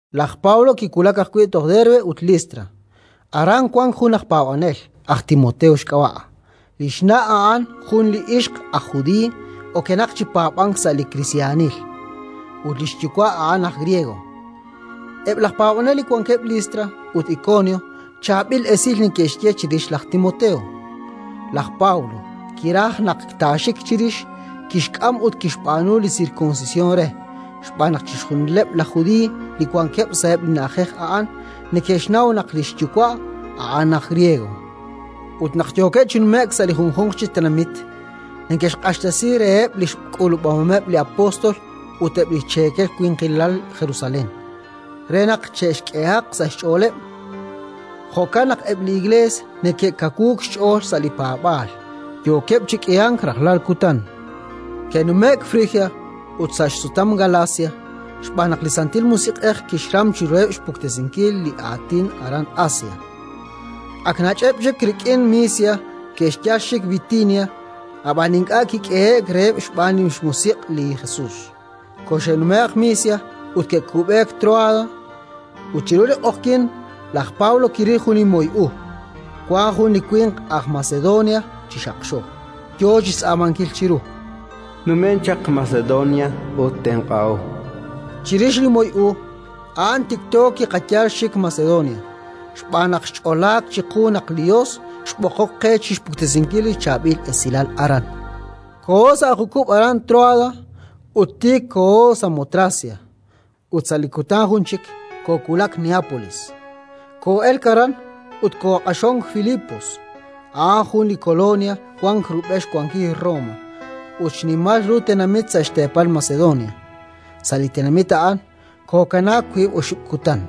Laj Pablo kiwulak ajwi' toj Derbe ut Listra. Aran wank jun aj paab'anel, aj Timoteo xk'ab'a': li xna' a'an jun li ixq aj judiiy okenaq chi paab'ank sa' li kristiyanil, ut li xyuwa' a'an aj griego. Eb' laj paab'anel li wankeb' Listra ut Ikonio chaab'il esil neke'xye chirix laj Timoteo. Laj Pablo kiraj naq taaxik chirix. Kixk'am ut kixb'aanu li sirkunsisyon re xb'aaneb' chixjunileb' laj Judiiy li wankeb' sa'eb' li na'ajej a'an: chixjunileb' neke'xnaw naq li xyuwa' a'an aj griego. Ut naq yookeb' chi nume'k sa' li junjunq chi tenamit, neke'xq'axtesi reheb' li xk'uub'ahomeb' li apóstol ut eb' li xcheekel winqilal Jerusalén, re naq che'xk'ehaq sa' xch'ooleb'. Jo'kan naq eb' li Iklees neke'kawuuk xch'ool sa' li paab'aal, yookeb' chi k'ihank rajlal kutan. Ke'nume'k Frigia ut sa' xsutam Galacia, xb'aan naq li Santil Musiq'ej kixram chiruheb' xpuktesinkil li Aatin aran Asia. Ak nach'eb' chik rik'in Misia, ke'xyal xik Bitinia, ab'an ink'a' kik'ehe'k reheb' xb'aan li xMusiq' li Jesus. Koxe'nume'q Misia ut ke'kub'eek Tróada. Ut chiru li q'oqyink laj Pablo kiril jun li moy u: wank jun li winq aj Macedonia chi xaqxo, yo chi xtz'aamankil chiru: “Numen chaq Macedonia ut tenq'aho”, chan re. Chirix li moy u a'an tikto kiqayal xik Macedonia, xb'aan naq xch'olaak chiqu naq li Yos xb'oqok qe chi xpuktesinkil li Chaab'il Esilal aran. Koo'ok sa' jukub' aran Tróada ut tiik kooho Samotracia, ut sa' li kutan jun chik koowulak Neápolis. Koo'elk aran ut kooq'axonk Filipos, a'an jun li kolonia wank rub'el xwankil Roma ut xnimal ru tenamit sa' xteepal Macedonia. Sa' li tenamit a'an kookanaak wiib' oxib' kutan.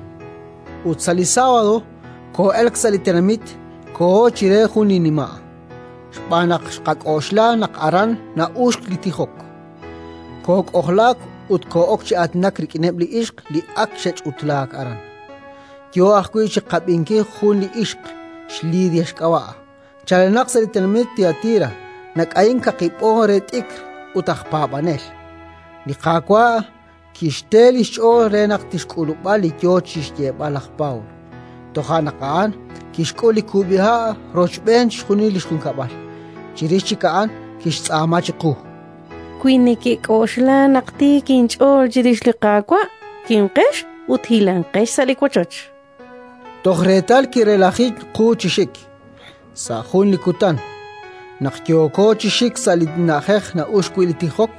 Ut sa' li sábado koo'elk sa' li tenamit, kooho chire jun li nima', xb'aan naq xqak'oxla naq aran na'uxk li tijok. Kook'ojlaak ut koo'ok chi aatinak rik'ineb' li ixq li ak xe'ch'utlaak aran. Yo ajwi' chi qab'inkil jun li ixq, xLidia xk'ab'a', chalenaq sa' li tenamit Tiatira, nak'ayink kaqi b'on re t'ikr, ut aj paab'anel. Li Qaawa' kixte li xch'ool re naq tixk'ulub'a li yo chi xyeeb'al laj Pablo. Toja' naq a'an kixk'ul li kub'iha' rochb'een chixjunil li xjunkab'al. Chirix chik a'an kixtz'aama chiqu: —Wi nekek'oxla naq tiik inch'ool chirix li Qaawa', kimqex ut hilanqex sa' li wochoch, chan. Toj reetal kirelaji qu chi xik. Sa' jun li kutan, naq yooko chi xik sa' li na'ajej na'uxk wi' li tijok,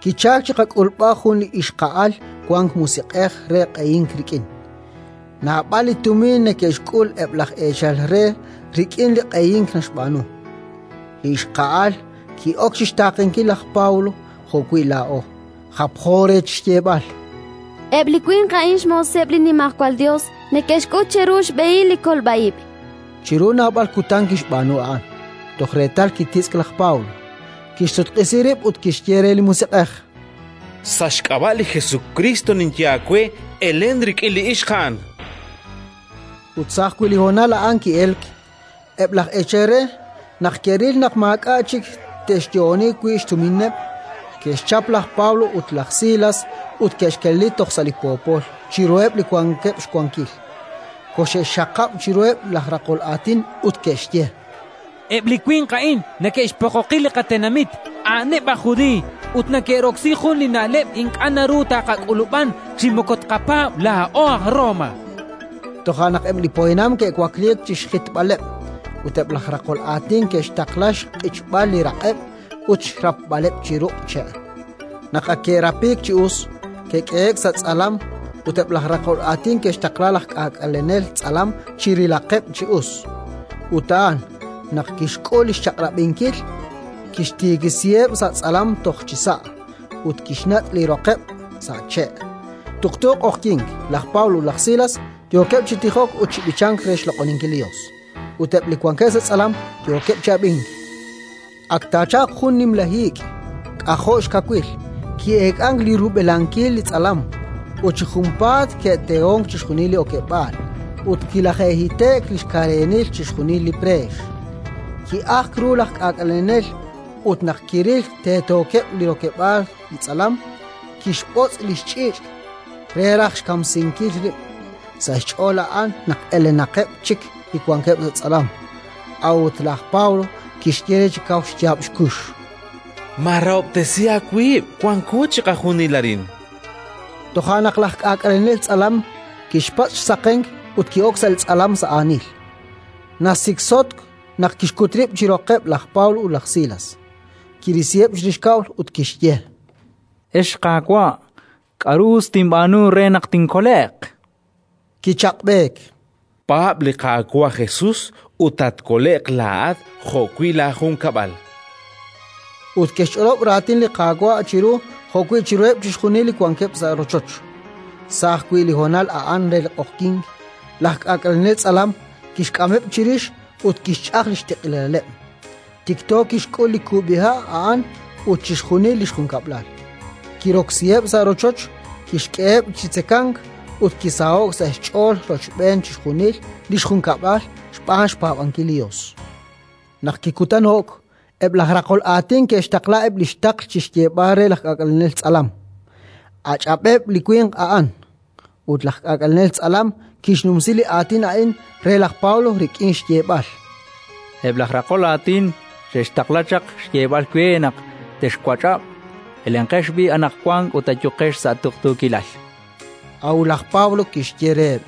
kichalk chi qak'ulb'al jun li ixqa'al wank musiq'ej re q'ehink rik'in: naab'al li tumin neke'xk'ul eb' laj eechal re rik'in li q'ehink naxb'aanu. Li ixqa'al ki'ok chi xtaaqenkil laj Pablo jo'wi' laa'o, japjo re chi xyeeb'al: —Eb' li winq a'in xmooseb' li Nimajwal Yos: neke'xk'ut cheru xb'ehil li kolb'a ib'. Chiru naab'al kutan kixb'aanu a'an, toj reetal kititz'k laj Pablo, kixsutq'isi rib' ut kixye re li musiq'ej: —Sa' xk'ab'a' li Jesukriist ninye aawe: Elen rik'in li ixq a'an! Ut sa' ajwi' li honal a'an ki'elk. Eb' laj eechal re, naq ke'ril naq maak'a' chik te'xyo'oni wi' xtumineb', ke'xchap laj Pablo ut laj Silas ut ke'xkeleli toj sa' li poopol, chiruheb' li wankeb' xwankil; koxe'xxaqab' chiruheb' laj raqol aatin ut ke'xye: —Eb' li winq a'in neke'xpoqoqi li qatenamit. A'aneb' aj Judiiy ut neke'roksi jun li na'leb' ink'a' naru taaqak'ulub'an chi moko tqapaab' laa'o aj Roma. Toja' naq eb' li poyanam ke'wakliik chi xjitb'aleb', ut eb' laj raqol aatin ke'xtaqla xq'ichb'al li raq'eb' ut xrapb'aleb' chi ruq' che'. Naq ak ke'rapiik chi us, ke'k'ehe'k sa' tz'alam ut eb' laj raqol aatin ke'xtaqla laj k'aak'alenel tz'alam chi rilaqeb' chi us. Ut a'an, naq kixk'ul li xchaq'rab'inkil, kixtiikisiheb' sa' tz'alam toj chisa' ut kixnat' li roqeb' sa' che'. Tuqtu q'oqyink laj Pablo ut laj Silas yookeb' chi tijok ut chi b'ichank re xloq'oninkil li Yos, ut eb' li wankeb' sa' tz'alam yookeb' chi ab'ink. Ak taachalq jun nimla hiik, k'ajo' xkawil: ki'eek'ank li rub'elankil li tz'alam, ut chi junpaat ke'tehonk chixjunil li okeb'aal ut kilaje'hite'k li xkareenil chixjunileb' li preex. Ki'ajk ru laj k'aak'alenel ut, naq kiril teetookeb' li rokeb'aal li tz'alam, kixb'otz' li xch'iich' re raj xkamsinkil rib': sa' xch'ool a'an naq elenaqeb' chik li wankeb' sa' tz'alam. A'ut laj Pablo kixye re chi kaw xyaab' xkux: —Maarahob'tesi aawib', wanko chiqajunil arin. Toja' naq laj k'aak'alenel tz'alam kixpatz' xsaqenk ut ki'ok sa' li tz'alam sa' aanil; nasiksotk naq kixkut rib' chi roqeb' laj Pablo ut laj Silas. Kirisiheb' chirix kab'l ut kixye: —Ex qaawa', k'aru us tinb'aanu re naq tinkole'q? Kichaq'b'eek: —Paab' li Qaawa' Jesus ut tatkole'q laa'at jo'wi' laajunkab'al. Ut ke'xch'olob' Raatin li Qaawa' chiru jo'wi' chiruheb' chixjunil li wankeb' sa' rochoch. Sa' ajwi' li honal a'an re li q'oqyink, laj k'aak'alenel tz'alam kixk'ameb' chirix ut kixch'aj li xtiq'ilaleb'; tikto kixk'ul li kub'iha' a'an ut chixjunil li xjunkab'al. Kiroksiheb' sa' rochoch, kixk'eheb' chi tzekank ut kisaho'k sa' xch'ool rochb'een chixjunil li xjunkab'al xb'aan xpaab'ankil li Yos. Naq kikutano'k, eb' laj raqol aatin ke'xtaqla eb' li xtaql chi xyeeb'al re laj k'aak'alenel tz'alam: “Ach'ab'eb' li winq a'an”. Ut laj k'aak'alenel tz'alam kixnumsi li aatin a'in re laj Pablo rik'in xyeeb'al: —Eb' laj raqol aatin xe'xtaqla chaq xyeeb'al we naq texwach'ab'. Elenqex b'i' anaqwan ut ayuqex sa' tuqtuukilal. A'ut laj Pablo kixye reheb':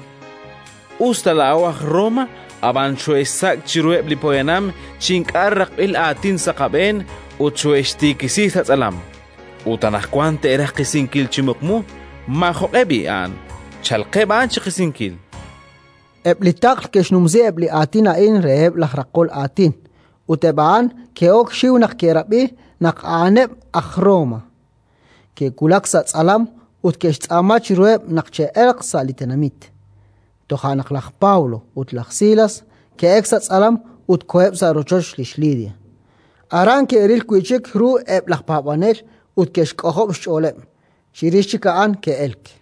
—Us ta laa'o aj Roma, ab'an xoohe'xsak' chiruheb' li poyanam chi ink'a' raqb'il aatin sa' qab'een, ut xoohe'xtiikisi sa' tz'alam. Ut anaqwan te'raj qisinkil chi muqmu! Maajoq'e b'i' a'an! Chalqeb' a'an chi qisinkil. Eb' li taql ke'xnumsi eb' li aatin a'in reheb' laj raqol aatin ut eb' a'an ke'ok xxiw naq ke'rab'i naq a'aneb' aj Roma. Ke'wulak sa' tz'alam ut ke'xtz'aama chiruheb' naq che'elq sa' li tenamit. Toja' naq laj Pablo ut laj Silas ke'elk sa' tz'alam ut koheb' sa' rochoch lix Lidia. Aran ke'ril wi' chik ru eb' laj paab'anel ut ke'xk'ojob' xch'ooleb'; chirix chik a'an ke'elk.